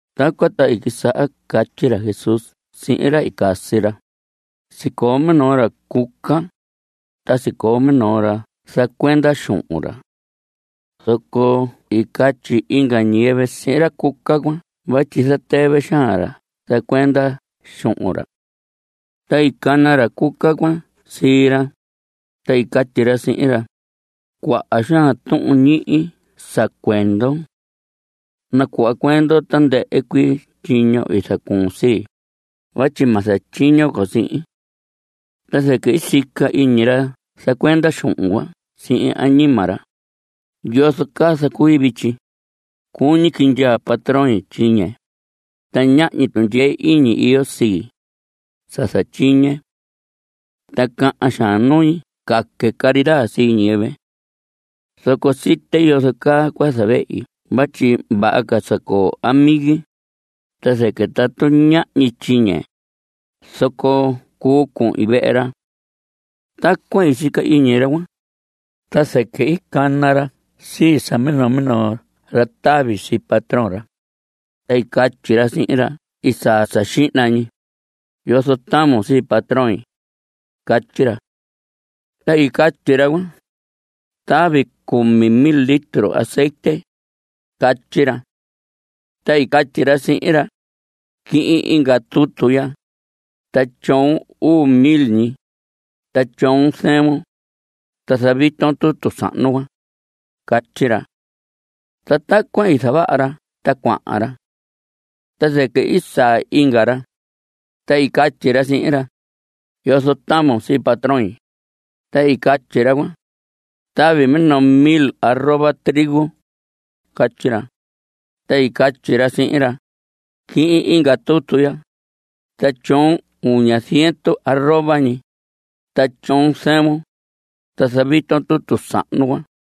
Tacuan ta i quisaha catyi ra Jesús sihin ra i casi ra: Sicoo minoo ra cuca, ta sicoo minoo ra zacuenda xuhun ra. Zoco i catyi inga ñiyɨvɨ sihin ra cuca cuan vatyi zatɨvɨ xaan ra zacuenda cuan xuhun ra. Ta i cana ra cuca cuan sii ra, ta i catyi ra sihin ra: “Cuaha xaan tuhun ñihi sa cuendon. Nacuhva cuendon tandɨhɨ cuii tyiño i zacuun sii, vatyi ma zatyiño con sihin.” Ta zɨquɨ i sica iñi ra zacuenda xuhun cuan sihin añima ra: “¿Yozo caa zacui vityi? Cuñi quindyaa patroin tyiñe, ta ñahñi tundyee iñi iyo sii, sa zatyiñe. Ta cahan xaan nui caque caridad sii ñiyɨvɨ. Zoco site yozo caa cua zavehi vatyi vaha sa coo amigi, ta zɨquɨ tatu ñahñi tyiñe, zoco cuu cuhin vehe ra.” Tacuan i sica iñi ra cuan, ta zɨquɨ i cana ra sii sa minoo minoo ra tavi sii patrón ra. Ta i catyi ra sihin ra i saa sa xihna ñi: “¿Yozo tavun sii patroin?” Catyi ra. Ta i catyi ra cuan: “Tavi cumi mil litro azetye.” Catyi ra. Ta i catyi ra sihin ra: “Quihin inga tutu ya, ta tyoon uu mil ñi, ta tyoon zɨvun, ta zaviton tutu sahnu cuan.” Catyi ra. Ta tacuan i zavaha ra ta cuahan ra. Ta zɨquɨ i saa inga ra, ta i catyi ra sihin ra: “¿Yozo tavun sii patroin?” Ta i catyi ra cuan: “Tavi minoo mil arroba trigo.” Catyi ra. Ta i catyi ra sihin ra: “Quihin inga tutu ya, ta tyoon uña ziendu arroba ñi, ta tyoon zɨvun, ta zaviton tutu sahnu cuan.”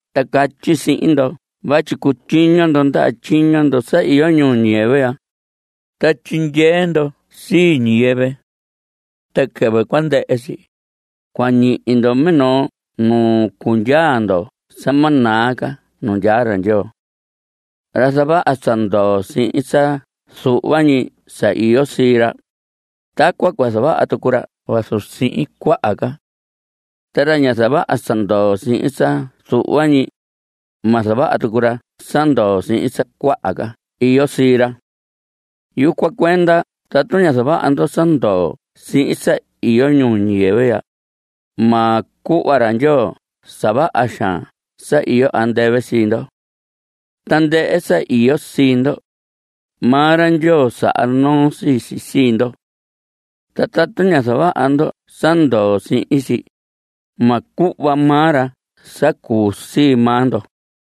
Ta catyi sihin ndo vatyi cutyiño ndo ndaha tyiño ndo sa iyo ñuu ñiyɨvɨ ya, ta tyindyee ndo sii ñiyɨvɨ. Ta quɨvɨ cua ndɨhɨ si, cua ñihi ndo minoo nu cundyaa ndo sa ma naa ca nu ndyaa ra Ndyoo. Ra zavaha sa ndoo sihin sa zuhva ñi sa iyo sii ra, tacuan cua zavaha tucu ra vazu sihin cuaha ca. Ta ra ña zavaha sa ndoo sihin sa zuhva ñi, ma zavaha tucu ra sa ndoo sihin sa cuaha ca iyo sii ra. Yucuan cuenda tatu ña zavaha ndo sa ndoo sihin sa iyo ñuu ñiyɨvɨ ya, ma cuhva ra Ndyoo sa vaha xaan sa iyo andɨvɨ sii ndo. Tandɨhɨ sa iyo sii ndo, maa ra Ndyoo saha noo sii si sii ndo. Ta tatu ña zavaha ndo sa ndoo sihin si, ma cuhva maa ra sa cuu sii maa ndo.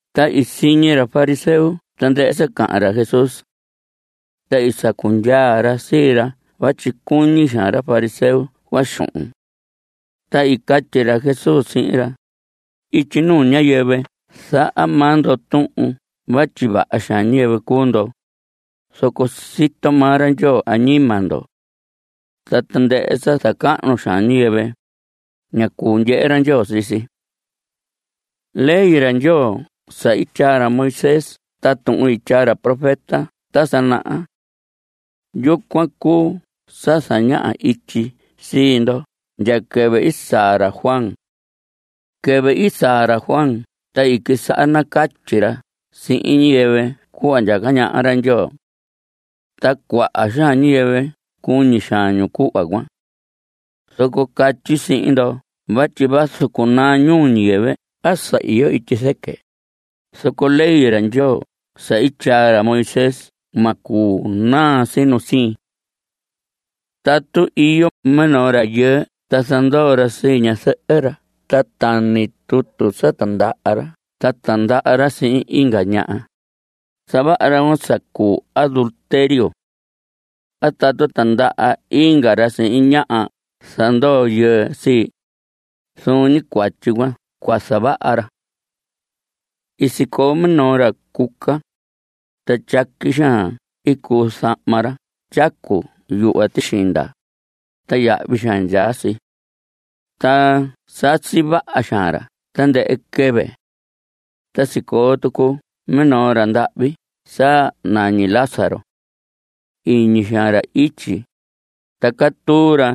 Ta i siñi ra fariseo tandɨhɨ sa cahan ra Jesús. Ta i sacu ndyaa ra sii ra vatyi cuñi xaan ra fariseo cuan xuhun. Ta i catyi ra Jesús sihin ra: Ityi nuu ñiyɨvɨ zaha maa ndo tuhun vatyi vaha xaan ñiyɨvɨ cuu ndo, zoco sito maa ra Ndyoo añima ndo. Ta tandɨhɨ sa zacahnu xaan ñiyɨvɨ, ña cuu ndyehe ra Ndyoo sii si. Ley ra Ndyoo sa i tyaa ra Moisés ta tuhun i tyaa ra profeta ta sa naha, yucuan cuu sa zañaha ityi sii ndo ndya quɨvɨ i saa ra Juan. Quɨvɨ i saa ra Juan ta i quisaha nacatyi ra sihin ñiyɨvɨ cuhva ndyaca ñaha ra Ndyoo. Ta cuaha xaan ñiyɨvɨ cuñi xaan ñu cuhva cuan. Zoco catyi sihin ndo vatyi vazu cunaa ñuu ñiyɨvɨ a sa iyo ityi zɨquɨ, zoco ley ra Ndyoo sa i tyaa ra Moisés ma cuu naa si nu siin. Tatu iyo minoo rayɨɨ ta zandoo ra sii ñazɨhɨ ra ta tani tutu sa tindaha ra ta tindaha ra sihin inga ñaha, zavaha ra cuan sa cuu adulterio. A tatu tindaha inga ra sihin ñaha sa zandoo yɨɨ sii, zuun ñi cuatyi cuan zavaha ra. I sicoo minoo ra cuca, ta tyaqui xaan i cuu zahma ra tyacu yuhva tixinda, ta yahvi xaan ndyaa si. Ta sasi vaha xaan ra tandɨhɨ quɨvɨ. Ta sicoo tucu minoo ra ndahvi sa nañi Lázaro. Iñi xaan ra ityi, ta catuu ra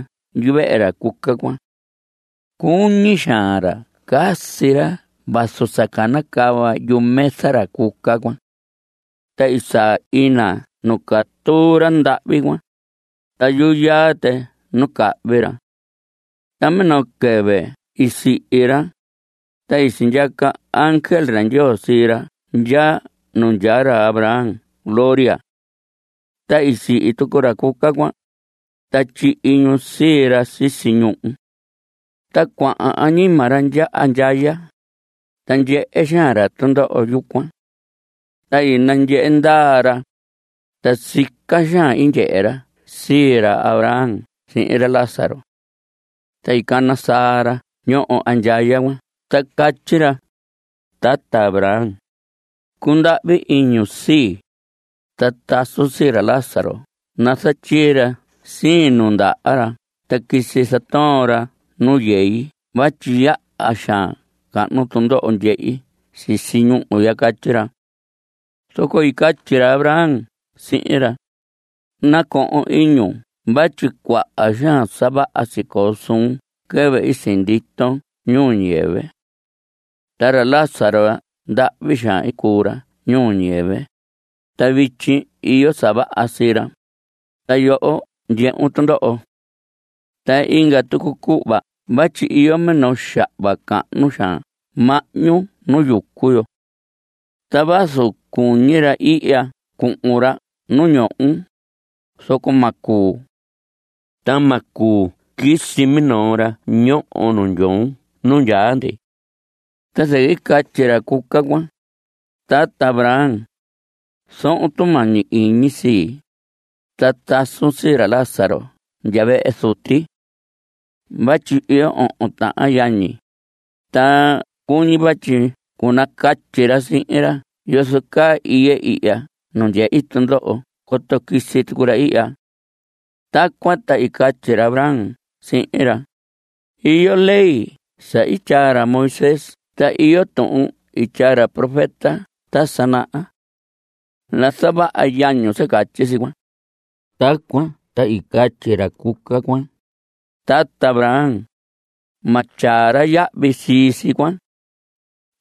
yuvehe ra cuca cuan. Cuñi xaan ra casi ra vazu sa canacava yumesa ra cuca cuan. Ta i saa ina nu catuu ra ndahvi cuan, ta yuyaa tɨ nu cahvi ra. Ta minoo quɨvɨ i sihi ra, ta i sindyaca ángel ra Ndyoo sii ra ndya nu ndyaa ra Abraham gloria. Ta i sihi tucu ra cuca cuan, ta tyihi ñu sii ra sisi ñuhu. Ta cuahan añima ra andyaya, ta ndyehe xaan ra tundoho yucuan. Ta i nandyehe ndaa ra, ta sica xaan i ndyehe ra sii ra Abraham sihin ra Lázaro. Ta i cana saa ra ñoho andyaya cuan ta catyi ra: “Tata Abraham, cundahvi iñun sii, ta tasun sii ra Lázaro nazatyii ra siin nundaha ra ta quisi zatoon ra nu yei vatyi yaha xaan cahnu tundoho ndyehi sisi ñúhu ya.” Catyi ra. Zoco i catyi ra Abraham sihin ra: “Nacohon iñun vatyi cuaha xaan sa vaha sicoo suun quɨvɨ i sinditon ñuu ñiyɨvɨ. Ta ra Lázaro ndahvi xaan i cuu ra ñuu ñiyɨvɨ. Ta vityi iyo sa vaha sii ra, ta yoho ndyehun tundoho. Ta inga tucu cuhva vatyi iyo minoo xahva cahnu xaan mahñu nu yucu yo. Ta vazu cuñi ra ihya cuhun ra nu ndyoon, zoco ma cuu. Ta ma cuu quisi minoo ra ñoho nu ñohon nu ndyaa ndi.” Ta zɨquɨ i catyi ra cuca cuan: “Tata Abraham, zohon tumañi iñi sii, ta tasun sii ra Lázaro ndya vehe zuti. Vatyi iyo ohon tahan yañi, ta cuñi vatyi cunacatyi ra sihin ra yozo caa iye ihya nu ndyehi tundoho coto quisi tucu ra ihya.” Tacuan ta i catyi ra Abraham sihin ra: “Iyo ley sa i tyaa ra Moisés ta iyo tuhun i tyaa ra profeta ta sa naha. Nazavaha yañun sa catyi si cuan.” Tacuan ta i catyi ra cuca cuan: “Tata Abraham, ma tyaa ra yahvi sii si cuan.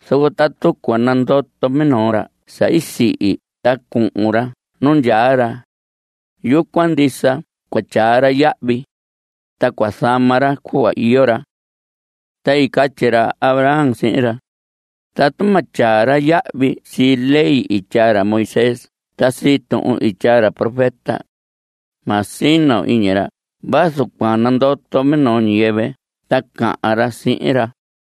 Zoco tatu cua nandoto minoo ra sa i sihi ta cuhun ra nu ndyaa ra, yucuan ndisa cua tyaa ra yahvi, ta cua zama ra cuhva iyo ra.” Ta i catyi ra Abraham sihin ra: “Tatu ma tyaa ra yahvi sii ley i tyaa ra Moisés ta sii tuhun i tyaa ra profeta, ma sino iñi ra vazu cua nandoto minoo ñiyɨvɨ ta cahan ra sihin ra.”